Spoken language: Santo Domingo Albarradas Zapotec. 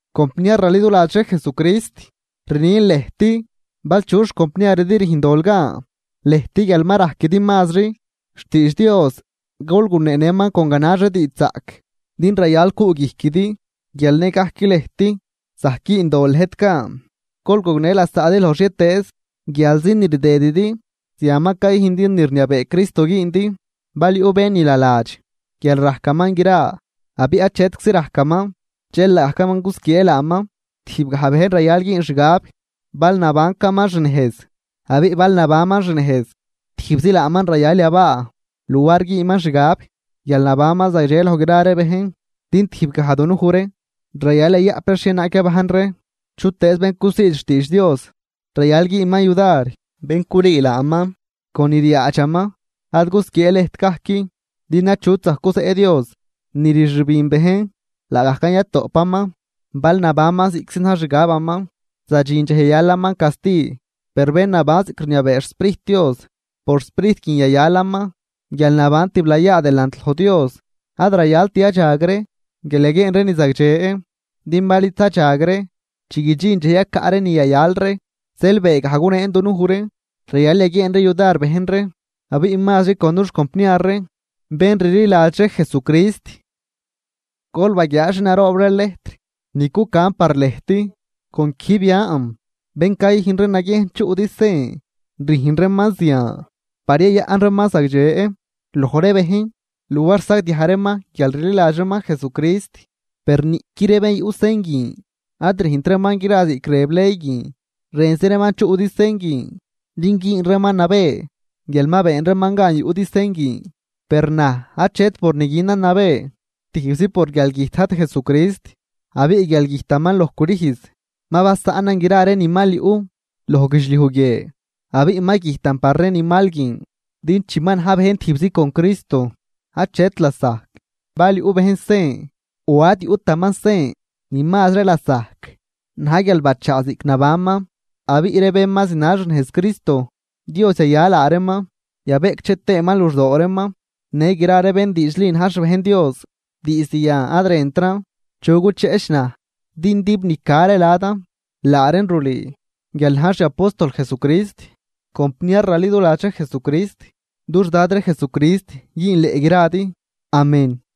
Compniar raliduladx ree Jesucrist, rnin lëjt, bal chu xcompniaridi rüjn dol gan, lëjt guial ma rajquidi mazri xtiidx Dios gol guneenëman con ganax ree diidxzaꞌc, din rayal cuꞌguijquidi guial nëgajc lëjt zajc güün dol lëjt gan. Gol gognë lasaꞌdi loj xhietëëz guialzi ni rdëdidi, zian ma cayüjndi ni rniabee Cristo güündi. Bal yuꞌ bén ni naladx guial rajcaman gra abiꞌ achetczi rajcaman, dxel laagajcaman cusquiee laaman. Tijbgaj bejn rayal güün xgab bal nabancaman xnejz. Abiꞌ bal nabanman xnejz, tijbzi laaman rayal yabaa luar güünman xgab guial nabanman zagdxe loj gra ree bejn. Din tijbgaj dunuj ree rayal yayaꞌp ree xhienaag yabajn ree. Chutëëz bén cusiid xtiidx Dios, rayal güünman yudar bén culüü laaman con ni ryaadxaman. Ad gusquiee lëjt gajc, din achut zajc guzeꞌ Dios. Ni rxübin bejn laagajcan yatoꞌpaman. Bal nabanman ziꞌctzi na̱j xixgabaman zadxin dxej yayalaman casti. Per bén naban ziꞌc rniabee xSprijt Dios, por Sprijt guin yayalaman guialnaban tiblayaa delant loj Dios. Ad rayalt yadxag ree guial yaguieen ree ni zagdxe, din bal id zadxag ree chi guidxin dxej yacaꞌ ree ni yayal ree. Zeel beegaj gunen dunuj ree rayal yaguieen ree yudar bejn ree, abiꞌ mazri con dux compniar ree bén rliladx ree Jesucrist. Gol baguiaa xi naroob ree lejtr ni cucan par lëjt con quijb yan. Bén cayüjn ree naguiejn chuꞌdi sen, rüjn reeman zian par yayaꞌn reeman zagdxe loj ree bejn luar sagdiaj reeman guial rliladx reeman Jesucrist. Per niꞌqui ree bén yuꞌ sen guin ad rüjnt reeman gra ziꞌc rëb ley guin. Rënzi reeman chuꞌdi sen guin din güün reeman nabë guial ma been reeman gan yuꞌdi sen guin. Per naj achet por ni günan nabë, tijbzi por guialgüjt Dad Jesucrist. Abiꞌ guial güjtaman loj crüjz ma basaꞌnan gra ree ni mal yuꞌ loj guidxliuj guie abiꞌ ma güjtan par ree ni mal guin. Din chi ma na̱j bejn tijbzi con Cristo, achet lasajc bal yuꞌ bejn sen o ad yuꞌtaman sen. Ni mazri lasajc na̱j guial ma bachaa ziꞌc nabanman. Abiꞌ ree bén ma zinal xnejz Cristo, Dios yaya laa reeman yabeꞌcdxe tëëman luxdoo reeman në gra ree bén diidxli na̱j xbejn Dios. Diizd yan ad rëntran chu gucheꞌch naj. Din dib ni ca ree ladan laa reen rulüü guial najn xiapóstol Jesucrist. Compniar raliduladx ree Jesucrist, dux Dad ree Jesucrist güünleꞌ gradi. Amén.